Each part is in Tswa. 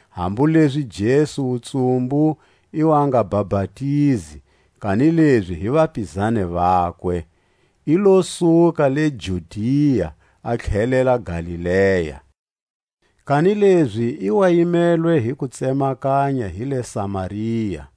hambu lezi Jesu wutsumbu i wa nga bapatizi, kanilezi hi vapizani vakwe, i lo suka le Judia, a tlhelela Galilea. Kanilezi i wa yimelwe hi ku tsemakanya hi le Samaria.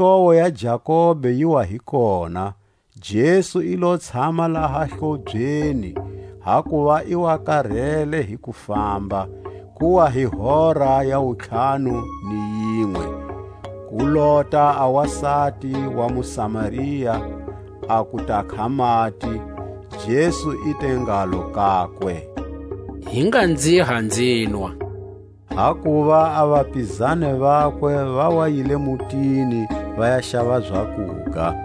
ni hlowo ya Jakobe yi wa hi kona. Jesu i lo tshama laha hlobyeni, hakuva i wa karele hi kufamba. Ku wa hi hora ya wuntlhanu ni yinwe. Ku lota a wasati wa muSamaria a ku takha mati; Jesu i te ngalo kakwe: Hi nga nziha nzinwa. Hakuva a vapizani vakwe va wa yile mutini va ya xava zakuga.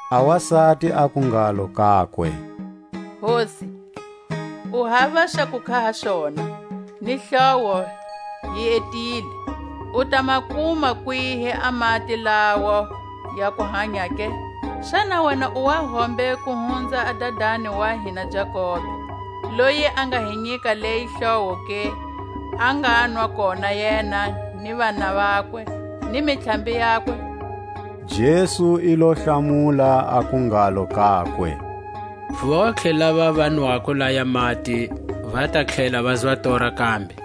A wasati aku ngalo kakwe: Hosi, u hava xa kukha ha xona, ni hlowo yi etile; u ta ma kuma kwihi a mati lawo ya kuhanya ke? Xana wena u wa hombe ku hunza a dadani wa hina Jakobe, loyi a nga hi nyika leyi hlowo ke, a nganwa kona yena, ni vana vakwe, ni mintlhambi yakwe? Jesu i lo hlamula, aku ngalo kakwe: Vontlhe lava va nwako laya mati va ta tlhela vazwa tora kambe;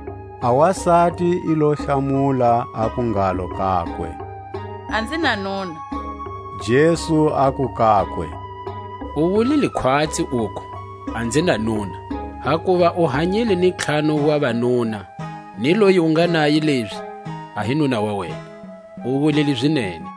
A wasati i lo hlamula, aku ngalo kakwe: A nzi na nuna. Jesu aku kakwe: U wulile khwatsi uku, A nzi na nuna; hakuva u hanyile ni ntlhanu wa vanuna; ni loyi u nga naye lezi a hi nuna wa wena; u wulile zinene.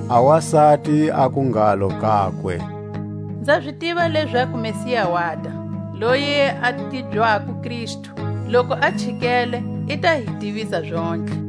A wasati aku ngalo kakwe: Nza zi tiva lezaku Messia wata, loyi a tibyako Kristu; loku a chikele, i ta hi tivisa zontlhe.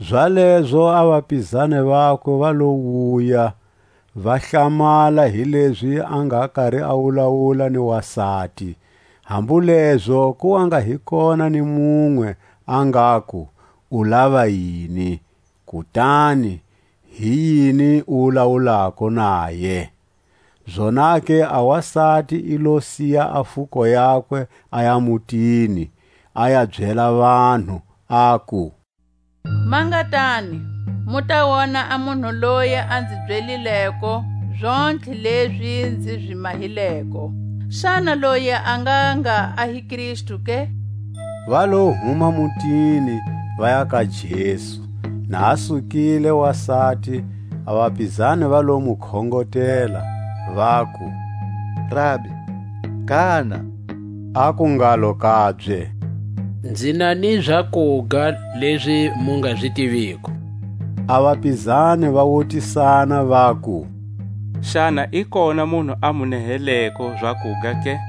Zalezo a vapizani vakwe va lo wuya, va hlamala hilezi a nga kari a wulawula ni wasati; hambu lezo ku wa nga hi kona ni munwe a ngaku: U lava yini? kutani: Hiyini u wulawulako naye? Zonake a wasati i lo siya a fuko yakwe, aya mutini, a ya byela vanhu, aku: Ma nga tani, mu ta wona a munhu loyi a nzi byelileko zontlhe lezi nzi zi mahileko; xana loyi a ngha nga a hi Kristu ke? Va lo huma mutini, vaya ka Jesu. Na a sukile wasati, a vapizani va lo mu khongotela, vaku: Rabi, gana! Aku ngalo kabye: Nzi na ni zakuga lezi mu nga zi tiviko. A vapizani va wutisana vaku: Xana i kona munhu a mu neheleko zakuga ke?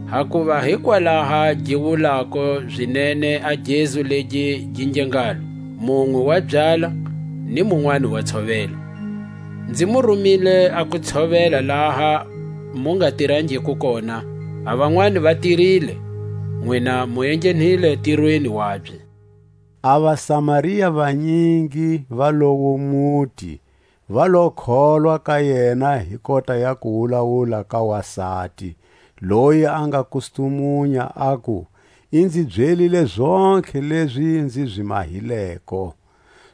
Hakuva hi kwalaha gi wulako zinene a gezu legi gi nge ngalo: Munwe wa byala, ni munwani wa tshovela. Nzi mu rumile a ku tshovela laha mu nga tirangiko kona; a vanwani va tirile, nwina mu enghenile ntirweni wabye. A vaSamaria vanyingi va lowo muti va lo kholwa ka yena hi kota ya kuwulawula ka wasati, loyi a nga kustumunya aku: I nzi byelile zontlhe lezi nzi zi mahileko.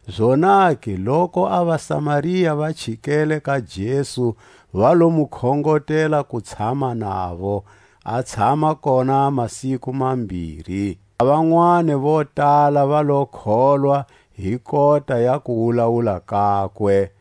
Zonake loku a vaSamaria va chikele ka: Jesu, va lo mu khongotela ku tshama navo; a tshama kona masiku mambiri. A vanwani vo tala va lo kholwa hi kota ya kuwulawula kakwe;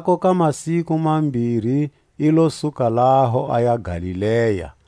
Anzhako ka masiku mambiri i lo suka laho, aya Galilea.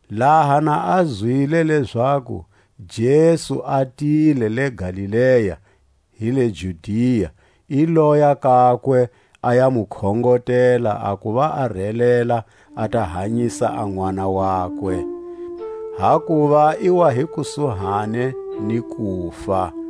Laha na a zwile lezaku Jesu a tile le Galilea hi le Judia, i loya kakwe, a ya mu khongotela a kuva a relela, a ta hanyisa a nʼwana wakwe; hakuva i wa hi kusuhani ni kufa.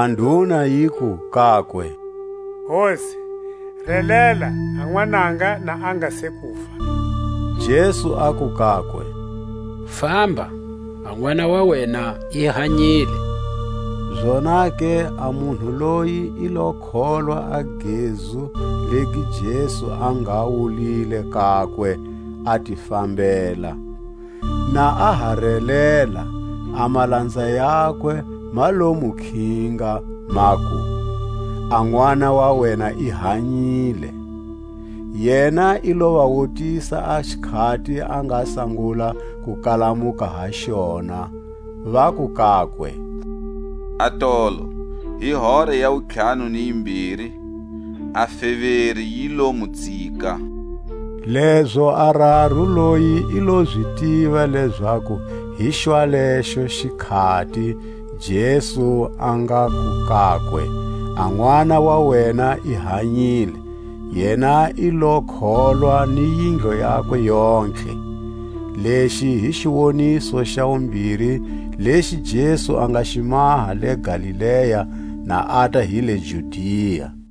A nduna yiku kakwe: Hosi, relela a nwananga na a nga se kufa. Jesu aku kakwe: Famba, a nʼwana wa wena i hanyile. Zonake a munhu loyi i lo kholwa a gezu legi Jesu a nga wulile kakwe, a ti fambela. Na a ha relela, a malanza yakwe ma lo mu khinga, maku: A nʼwana wa wena i hanyile. Yena i lo va wutisa a xikhati a nga sangula ku kalamuka ha xona. Vaku kakwe: Atolo, hi hora ya wuntlhanu ni yimbiri a feveri yi lo mu tsika. Lezo a raru loyi i lo zi tiva lezaku hi xwalexo xikhati Jesu a ngaku kakwe: A nʼwana wa wena i hanyile. Yena i lo kholwa ni yindlu yakwe yontlhe. Lexi hi xiwoniso xa wumbiri lexi Jesu a nga xi maha le Galilea na ata hi le Judia.